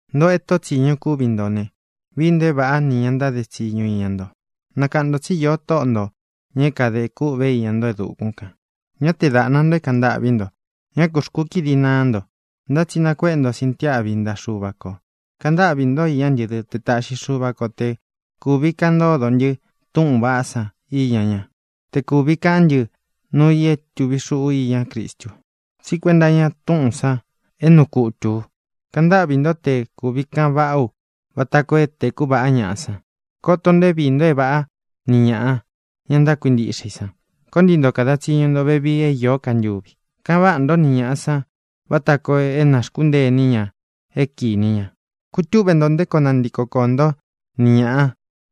Ntōꞌo e tóꞌo tsīñu kúvi nto ne, vií nto é vāꞌá nī ña ntáde tsiñu iña nto. Nakaꞌan ntō tsí īo Tóꞌo ntō, ña é kadē kûꞌvé iña nto e dukún kān. Ñá tee dāꞌna nto é kāꞌan ntâꞌví nto. Ñá kū xkukídi naá nto, ntá tsi nakuéꞌe nto sintiáꞌvi ntaꞌa Xuva kō. Kaꞌan ntáꞌvī ntó iñá ntɨ dɨ́ te taꞌxi Xuva ko te kūvi kaꞌan ntódo ntɨ túꞌūn vaꞌá san iña ñá, te kūvi kaꞌán ntɨ nuu i é tuvi xuꞌu iñá Cristu, tsí kuenta iña túꞌūn san é nuu kutū u. Kaꞌan ntáꞌvī ntó te kūvi kaꞌan vaꞌá u vata koo é tēku vaꞌá ñaꞌa san. Koto nto é viī nto é vāꞌá ni ñāꞌa, ña ntákuintiꞌxe i san. Koo ntii nto kada tsiñu nto vevii é īó ka ntuvi. Kaꞌan váꞌa nto ni ñāꞌa san vata koo é nā xkúntee iní ña é kīni ña. Kutúꞌve nto nté koo nantiko koō ntó ni ñāꞌá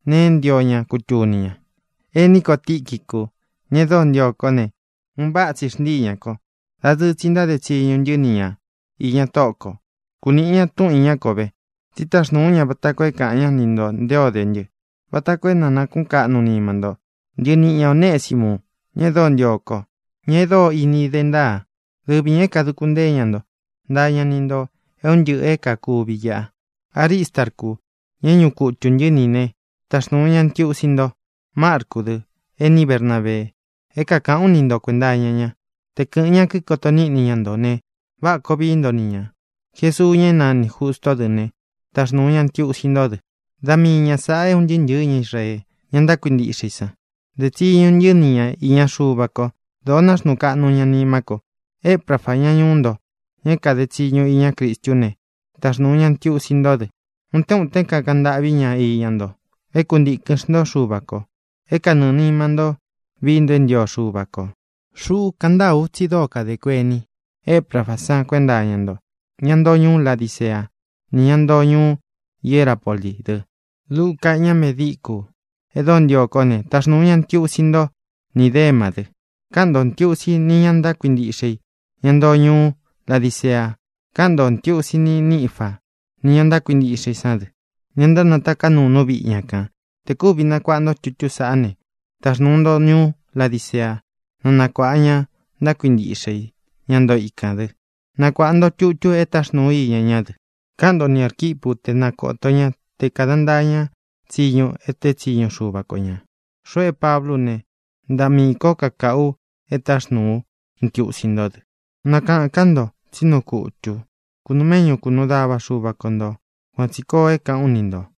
nēe é ntio ña kutuni ña. Ení ko Tīquicu, ña e dóo ntio kó ne, un váꞌa tsi xntíi ñā ko. Dadɨɨ tsi ntáde tsiñu ntɨ́ ni ña īña Tóꞌo kō. Kuniꞌi ña túꞌun īñá ko ve. Tsi táxnūu ú ña vata koo é kāꞌan ñá ni ntō nté o de ntɨ, vata koo é na nākuꞌún kaꞌnu nima nto. Ntɨniꞌi ña Onēsimu, ña e dóo ntio ko, ña e dóo ini dé ntaa, dɨvi ñā é kāduku ntée ña nto. Ntaa ña ni ntō é un ntɨꞌɨ̄ é kākuvi iꞌa. Aristarcu, ña é ñuꞌu kutū ntɨ́ ni ī né, taxnūu ña ntiusi nto. Marcú dɨ, ení Bernabee. É kākaꞌán u ni nto kuēnta iña ña. Te kɨ̄ꞌɨn ña kikoto níꞌni ña ntō ne, váꞌa kōo vií nto ni ñā. Jesuú, ña é nanī Justó dɨ ne, taxnūu ña ntiusi ntó dɨ. Da mii ña sāꞌa é un ntɨɨ́ ntɨ̄ɨ́ ña Israee, ña ntákuintiꞌxe i san, dé tsiñu ntɨ́ ni ña īña Xuva ko. Dōo náxnuu kaꞌnu ña nimá ko. Eprafa, ñá ñuú nto, ña é kade tsiñu iñá Cristú ne, taxnūu ña ntiusi ntó dɨ. Utén utén kakaꞌan ntâꞌví ña iña nto é kuntīkɨn xntó Xuva kō, é kanɨɨ̄ nima ntó vií nto é ntio Xuva kō. Xuꞌú kaꞌan ntaa ú tsi dóo kadē kuení Eprafá san kuenta iña nto, ña ntoo ñuú Ladicea ni ñá ntoo ñuú Hierapolí dɨ. Luca, ña medíkū e dóo ntio kó ne, taxnūu ña ntiusi nto, ní Demá dɨ. Káꞌan ntō ntiusi ní ña ntákuintiꞌxe i, ña ntoo ñuú Ladicea. Káꞌan ntō ntiusi ní Nifá, nī ña ntákuintiꞌxe i sán dɨ, ña ntánataká nuu nú viꞌi ña kān. Tē kúvi nakuāꞌa nto tutú saꞌá ne, taxnūu nto ñuú Ladicea, na nakuāꞌa ña ntákuintiꞌxe i, ñá ntoo ikān, dɨ. Nakuāꞌa nto tutu e táxnūu ú iña ñá dɨ. Káꞌan nto ni Ārquipú te na kōto ñá te kāda ntaa ña tsiñu é tēé tsiñu Xuva ko ñā. Xuꞌu é Pablú u ne, ntaꞌa miī kó kakaꞌu u é taxnūu ú ntiusi ntó dɨ. Nakaꞌān ká nto tsí nuu kutū u. Kūnuu méꞌñu kunuu dava Xuva ko ntō. Kuan tsī koo é kāꞌán u ni ntō.